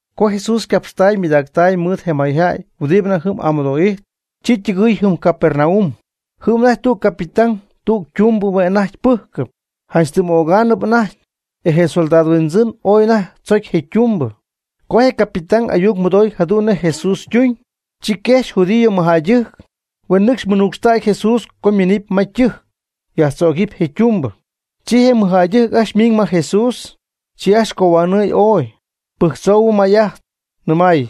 Co Jesús ycapxtaay ymɨydactaay mɨɨd je mayjäy huɨdi anajty jɨm amɨdo'ijtp, chi ytɨgɨɨy jɨm Capernaum. Jɨm anajty tüg Capɨtán tüg ytumbɨ hue' anajty pɨ́jcɨp, janch tɨm ögaanɨp anajty, e je soldado huindzɨn ooy anajty tzocy je ytumbɨ. Co je capitán ayuc mɨdooy jadu'n nej Jesús ytuñ, chi quejxy judío mɨjjäydɨjc, huen nɨcxy mɨnuucxtaaccɨxy Jesús co je' yminɨpy ma ytɨjc yajtzögɨɨyb je' ytumbɨ. Chi je mɨjjäydɨjc ajcxy ymiiñ ma Jesús, chi ajcxy cohuanɨɨy ooy, pɨjctzou may'ajt, nɨmay: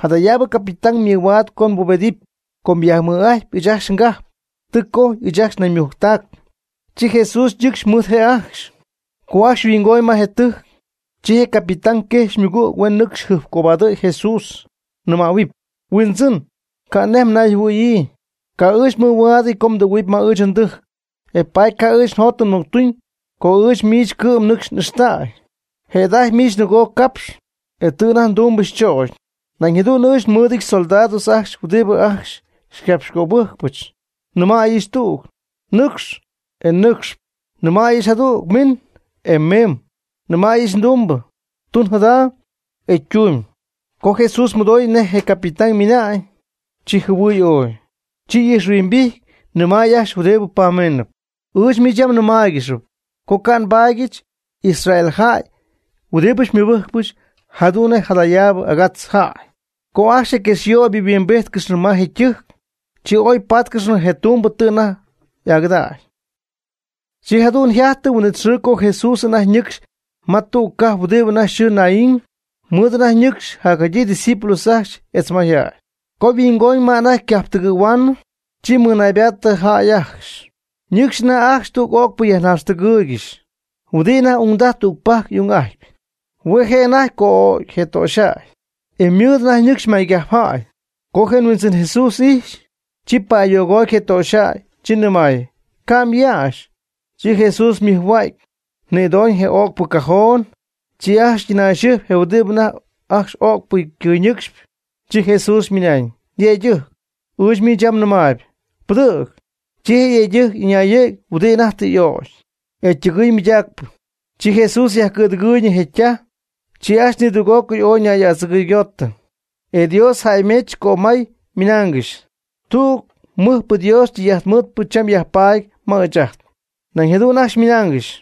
―Jadayaabɨ capitán ymɨhuaad co mbubedɨpy, com yajmɨj'ajtpy ɨɨch ajcxy ngajp, tɨ cojy ɨɨch ajt naymujctac. Chi Jesús ñɨcxy mɨɨd je' ajcxy. Co ajcxy mɨhuingooñ je tɨjc, chi je capitán quejxy ymɨgüg huen nɨcxy jɨjpcobadɨ̈y Jesús, nɨmähuɨpy: ―Huindzɨn, ca' nej mnayjɨhuɨ̈yii, ca' ɨɨch mɨhuaadɨty co mdɨgɨ̈huɨpy ma ɨɨch ndɨjc. E paady ca' ɨɨch njot tɨ mɨctuñ co ɨɨch miich cɨ'm nɨ́cx n'ixtäy. Jëda'ajty miich nɨgoo capx, e tɨ anajty ndumbɨch chögy. Nañ jadu'n ɨɨch nmɨɨdɨch soldados ajcxy huɨdi ajcxy xycapxcöbɨjcpɨch. Nɨmäyɨch tüg: “Nɨcx”, e nɨcxp; nɨmäyɨch jadüg: “Min”, e mimb; nɨmäyɨch ndumbɨ: “Tun jada”, e ytumyb. Co Jesús mɨdoy nej je capitán ymɨnañ, chi jɨhuɨɨy ooy, chi ni'ijxhuimbijty nɨmay ajcxy huɨdi pamiinɨp: ―Ɨɨch miich yɨm nɨmaaygɨxyp co ca' nbaadyɨch Israel jäy huɨdibɨ xymɨbɨ́jcpɨch jadu'n nej jadayaab agatz jäy. Co ajcxy je quexyöybɨ yhuimbíjtcɨxnɨ ma je tɨjc, chi oy páatcɨxnɨ je tumbɨ tɨ anajty y'agɨdägy. Chi jadu'n yjajty huin'it xɨɨ co Jesús anajty ñɨcxy ma tüg cajp huɨdi anajty yxɨɨ Naín. Mɨɨd anajty ñɨcxy jadyii ydiscípulos ajcxy etz mayjäy. Co yhuingooñ ma anajty ycajp tɨgɨ̈huaanɨ, chi mɨnaybaatɨ jäy ajcxy, ñɨcxy anajty ajcxy tüg öcpɨ yajnaaxtɨgɨɨygɨxy, huɨdi anajty ungdaj tügpajc y'ung'ajtpy. Hue' je' anajty co'ögy je töxyjäy, e mɨɨd anajty ñɨcxy maycajpjäy. Co je Huindzɨn Jesús ijxy, chi pa'ayogoty je töxyjäy, chi nɨmay: ―Ca' myäxy. Chi Jesús ymɨjhua'cy, nïdoñ je öcpɨ cajón. Chi ajcxy ytɨnayxɨjpy je huɨdi anajty ajcxy öcpɨ cɨyñɨcxp. Chi Jesús ymɨnañ: ―Yëydɨjc, ɨɨch miich yam nɨmaayb, pɨdɨ̈g. Chi je yëydɨjc ɨñayɨ̈gy huɨdi anajty tɨ y'ögy, e ytɨgɨɨy mɨydaacp. Chi Jesús yajcɨ̈dɨgɨɨyñɨ je' ytaj. Chi ajcxy nidüg'ócɨy ooy ñay'adzɨgɨygotɨ, e Dios jäymejch cömay, ymɨnaangɨxy: ―Tüg mɨjpɨ Dios tɨy'ajtmɨɨtpɨ cham yajpatp ma ɨɨch ajt. Nañ jadu'n ajcxy ymɨnaangɨxy: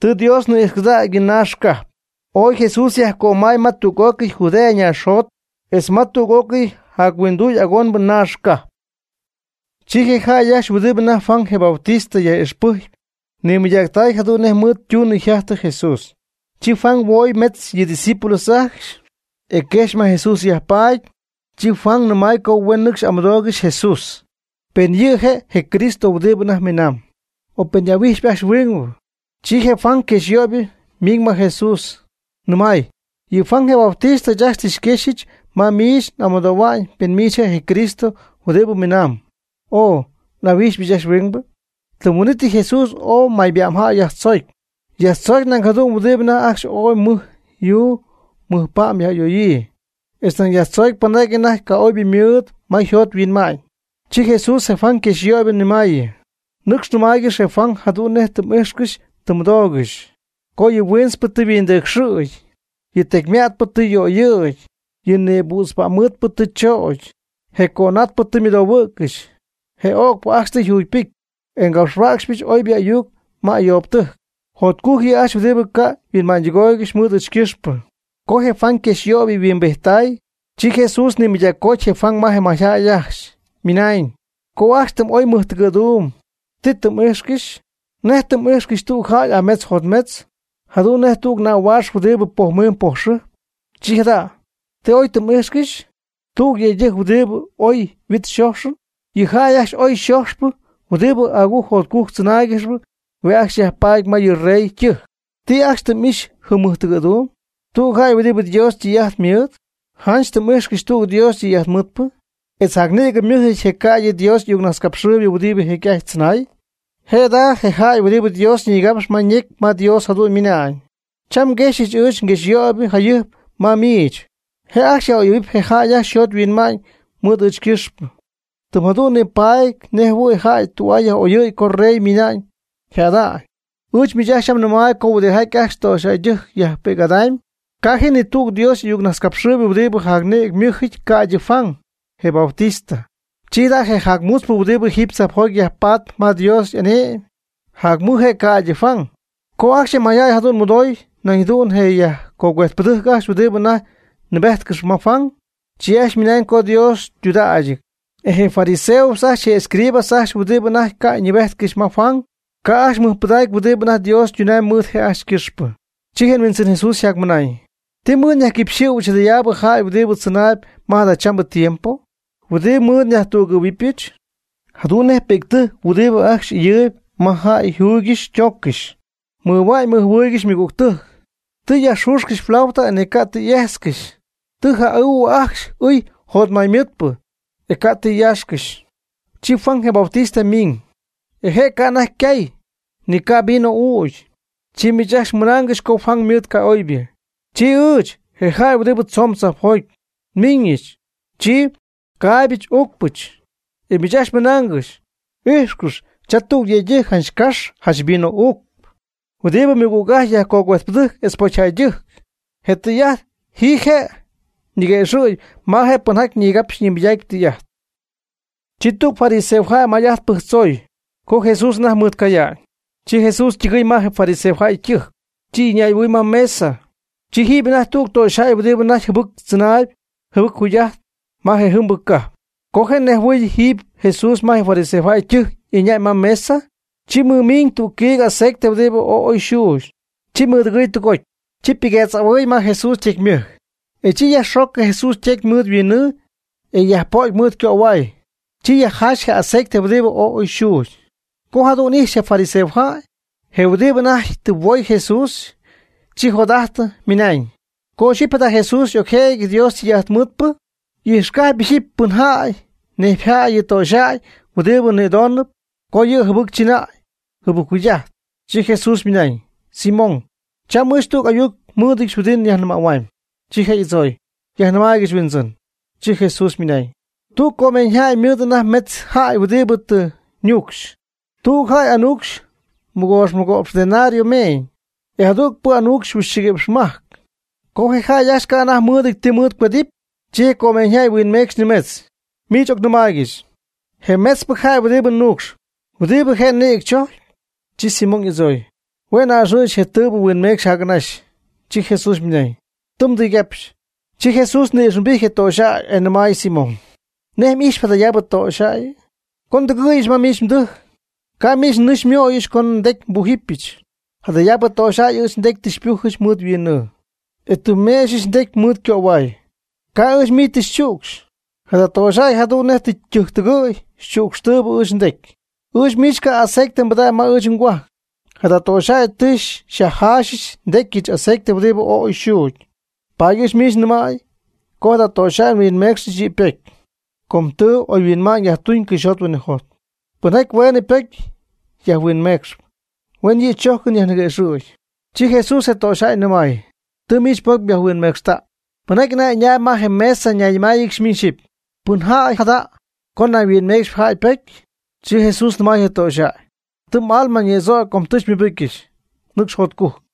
―Tɨ Dios ni'ijxcɨdägy yɨ yñaax ycajp. Ooy Jesús yajcömay ma tüg'ócɨy Judea naaxjot, etz ma tüg'ócɨy jac huinduy agonbɨ naax cajp. Chi je jäy ajcxy huɨdi anajty Juan je Bautista yaj'ixpɨjcpy nimɨydactay jadu'n nej mɨɨd ytunɨ yjajtɨ Jesús. Chi Juan huooy metz yɨ' ydiscípulos ajcxy, e quejxy ma Jesús yajpaady. Chi Juan nɨmay co huen nɨcxy amɨdoogɨxy Jesús, pen yɨ' je' je Cristo huɨdi anajty miinaam, o pen n'ahuíjxpy ajcxy huingbɨ. Chi je Juan yquejxyöybɨ miiñ ma Jesús nɨmay: ―Yɨ Juan je Bautista ɨɨch ajcxy tɨ xyquéxyɨch ma miich amɨdohua'ñ pen miich je' je Cristo huɨdi minaamb, o ¿n'ahuíjxypɨch ajcxy huingbɨ? Tɨm huin'ítɨy Jesús ooy mayba'mjäy yajtzoocy. Yajtzoocy nañ jadu'n huɨdi anajty ajcxy ooy mɨj yuu mɨj pa'm yaj'ayoyii, etz nañ yajtzoocy pɨnjaty anajty ca'oybɨ mɨɨd ma yjot yhuinma'ñ. Chi Jesús je Juan yquejxyöybɨ nɨmaayɨ: ―Nɨcx nɨmaaygɨx je Juan jadu'n nej tɨ m'íjxcɨxy tɨ mmɨdoogɨxy, co yɨ huintzpɨ tɨ yhuindɨcxɨ̈gy, yɨ tecyma'tpɨ tɨ yöyɨ̈gy, yɨ nïbützpa'mmɨɨdpɨ tɨ chögy, je cönatpɨ tɨ ymɨdohuɨ̈ccɨxy, je öcpɨ ajcxy tɨ yjugypɨjcy, e ngapxhuäcxyɨch oybɨ ayuc ma ayoobtɨjc. Jotcujc yɨ' ajcxy huɨdi ca' huinma'ñytɨgooygɨxy mɨɨd ɨɨch ycɨxpɨ. Co je Juan yquexyyöybɨ yhuimbijttay, chi Jesús nimɨydaccoty je Juan ma je mayjäy ajcxy, ymɨnañ: ―Co ajcxy tɨ m'oy mɨjtɨgɨ̈duum, ¿ti tɨ m'íjxcɨxy? ¿Nej tɨ m'íjxcɨxy tüg jäy ametz jotmetz, jadu'n nejhuɨ̈y tüg nähuaax huɨdi pojmiimb pojxɨjp? Chi jada', ¿ti oy tɨ m'íjxcɨxy? ¿Tüg yëydɨjc huɨdi mɨɨd oy yhuit yxöxyɨty? Yɨ jäy ajcxy oy yxojxypɨ huɨdi agujc jotcujc tzɨnaaygɨxp hue' ajcxy yajpaady ma yɨ rey ytɨjc. ¿Ti ajcxy tɨ m'ixy jɨm mɨjtɨgɨ̈duum? ¿Tüg jäy huɨdi Dios ytɨy'ajt mɨɨd? Janch tɨ m'íjxcɨxy tüg Dios ytɨy'ajtmɨɨdpɨ, etz jacnïgɨ ymɨ́jɨty je' ca'ydɨ Dios y'ayucnajtzcapxɨɨybɨ huɨdi jecy'ajty tzɨnay. Je' jada je jäy huɨdi Dios ñigapxyp ma ñecy ma Dios jadu'n ymɨnañ: Cham nguejxyɨch ɨɨch nguexyöybɨ jayɨjp ma miich, je' yaj'oyɨ̈huɨp je jäy ajcxy yjot yhuinma'ñ mɨɨd ɨɨch ycɨxp, tɨm jadu'n nipaady nej jɨhuɨ̈y jäy tü'aa yaj'oyɨ̈y co rey ymina'ñ yjäda'ñ. Ɨɨch miich ajcxy yam nɨmaayb co huɨdijaty ajcxy töxyjäydɨjc yajpi'c'ajtpy, ca' ji ni tüg Dios y'ayucnajtzcapxɨɨybɨ huɨdibɨ jacnïgɨ ymɨ́ jɨty ca'ydɨ Juan, je Bautista. Chi jada' je jac mutzpɨ huɨdi jiiby tzajpjoty yajpaatp ma Dios y'ane'my, jacmɨj je' ca'ydɨ Juan. Co ajcxy je mayjäy jadu'n mɨdoy nañ jadu'n je yajcogüejtpɨdɨjc ajcxy huɨdi anajty nɨɨbéjtcɨxy ma Juan, chi ajcxy mɨnañ co Dios ytudägyɨty. E je fariseos ajcxy etz je escribas ajcxy huɨdi anajty ca' nɨɨbéjtcɨxy ma Juan, ca' ajcxy mɨjpɨdacy huɨdi anajty Dios ytunamy mɨɨd je' ajcxy ycɨxpɨ. Chi je Huindzɨn Jesús ymɨnañ: ―¿Ti mɨɨd nyajquipxɨ̈huɨbɨch jadayaabɨ jäy huɨdi tzɨnayb ma jadachambɨ tiempo? ¿Huɨdi mɨɨd nyajtügɨ̈huɨbɨch? Jadu'n nej pi'ctɨjc huɨdi ajcxy ɨyɨɨyb ma jäy yjuygɨxy ytooccɨxy. Mɨjhuan mɨjjɨhuɨɨygɨxy ymɨgügtɨjc: “Tɨ njayajxüxɨch flauta e ni ca' tɨ m'éjtzcɨxy; tɨ nja'ɨɨhuɨ ajcxy ɨɨy jotmaymɨɨdpɨ, e ca' tɨ myaaxcɨxy.” Chi Juan je Bautista ymiiñ, e je' ca' anajty cay, ni ca' vino ügy, chi miich ajcxy mɨnaangɨxy co Juan ymɨɨd ca'oybɨ. Chi ɨɨch, je jäy huɨdi tzoon tzajpjoty, nmiñɨch, chi caaybɨch uucpɨch, e miich ajcxy mɨnaangɨxy: “Ijxcɨx, cha tüg yëydɨjc janch cax janch vino uucp, huɨdi mɨgüg'ajtpy yajcuëjtpɨdɨjc etz pocyjäydɨjc.” Je tɨy'ajt ji je' ñiguëxɨ̈gy ma je pɨnjaty nigapxp nimɨydaacp tɨy'ajt. Chi tüg fariseojäy may'ajt pɨjctzoy, co Jesús anajty mɨɨd ycaya'ñ. Chi Jesús ytɨgɨɨy ma je fariseojäy ytɨjc, chi ɨñay'ahuɨɨy ma mesa. Chi jɨm anajty tüg töxyjäy huɨdibɨ anajty jɨbɨc tzɨnaayb jɨbɨc jugy'ajtp ma je jɨmbɨ cajp. Co je' nejhuɨɨy jiiby Jesús ma fariseojäy ytɨjc ɨñäy ma mesa, chi mɨmiiñ tüg quiig aceite huɨdibɨ ooy oy xuugy, chi mɨdɨgɨɨy tɨgoty. Chi ypɨguetz'ahuɨy ma Jesús ytecy ymɨjc, e chi yajxoocɨ Jesús ytecy mɨɨd huinnɨɨ e yajpöt mɨɨd ycöhuay, chi yajjaaxy je aceite huɨdi ooy oy xuugy. Co jadu'n ijxy je fariseojäy, je' huɨdibɨ anajty tɨ huoy Jesús, chi jot'ajtɨ ymɨnañ: ―Co ixyipy jada Jesús y'ocjëjɨty Dios ytɨy'ajtmɨɨdpɨ, y'ijxcajpy ixyipy pɨn jäy nejpy jäy yɨ töxyjäy huɨdibɨ nïdoonɨp co yɨ' yjɨbɨctzɨnäy yjɨbɨcjugy'aty. Chi Jesús ymɨnañ: ―Simón, cham ɨɨch tüg ayuc nmɨ́ɨdɨdyɨch huɨdi nyajnɨmähuamy. Chi je' y'adzooy: ―Yajnɨmaaygɨch, Huindzɨn. Chi Jesús ymɨnañ: ―Tüg comeeñyjäy ymɨɨd anajty metz jäy huɨdi tɨ ñuucxy. Tüg jäy anuucxy mɨgoox mɨgo'px denario meeñ, e je jadügpɨ anuucxy huixchɨgui'px majc. Com je' ajcxy ca' anajty mɨɨdɨty ti mɨɨd cuedɨp, chi je comeeñyjäy huinmecxy nimetz. Miich ocnɨmaaygɨch, ¿je metzpɨ jäy huɨdi nuucxy, huɨdibɨ je' nïgɨ chojpy? Chi Simón y'adzooy: ―Hue' n'a'ɨxɨɨyɨch je tɨɨbɨ huinmecxy jac'anaxy. Chi Jesús ymɨnañ: ―Tɨ mdɨygapxy. Chi Jesús ni'ijxhuimbijty je töxyjäy, e nɨmay Simón: ―¿Nej m'ijxyp jadayaabɨ töxyjäyɨ? Co ndɨgɨɨyɨch ma mdɨjc, ca' miich nɨɨ xymooyɨch co ndecy nbújɨbɨch. Jadayaabɨ töxyjäy ɨɨch ndecy tɨ xypújɨp mɨɨd yhuinnɨɨ, e tɨ xyméexyɨch ndecy mɨɨd ycöhuay. Ca' ɨɨch miich tɨ xychücxy. Jada töxyjäy jadu'n nej tɨ ytɨjc tɨgɨ̈y, xychücxtɨɨyb ɨɨch ndecy. Ɨɨch miich ca' aceite mbɨdägy ma ɨɨch ngohuajc. Jada töxyjäy tɨ xyajjaaxɨ ndecyɨch aceite huɨdi ooy oy xuugy. Paady ɨɨch miich nyajnɨmäy co jada töxyjäy huinmeecxɨ yɨ' ymaybocy, co tɨɨbɨ oyhuinma'ñ yajtuñ cɨxyjot huinɨjot. Pɨnjaty hueenɨ ypocy yajhuinmecxɨ, hueenɨ yɨ' chójcɨn yajniquëxɨ̈gy. Chi Jesús je töxyjäy nɨmay: ―Tɨ miich mbocy yajhuinmecxtäy. Pɨnjaty anajty ɨñaayb ma je mesa ñayñɨmáayɨgɨxy miñ xyɨpy: ―¿Pɨn jäy jada jada' co nañ yhuinmeecxɨpy jäy ypocy? Chi Jesús nɨmay je töxyjäy: ―Tɨ m'alma ñïdzögy co tɨ xymɨbɨcyɨch. Nɨcx jotcujc.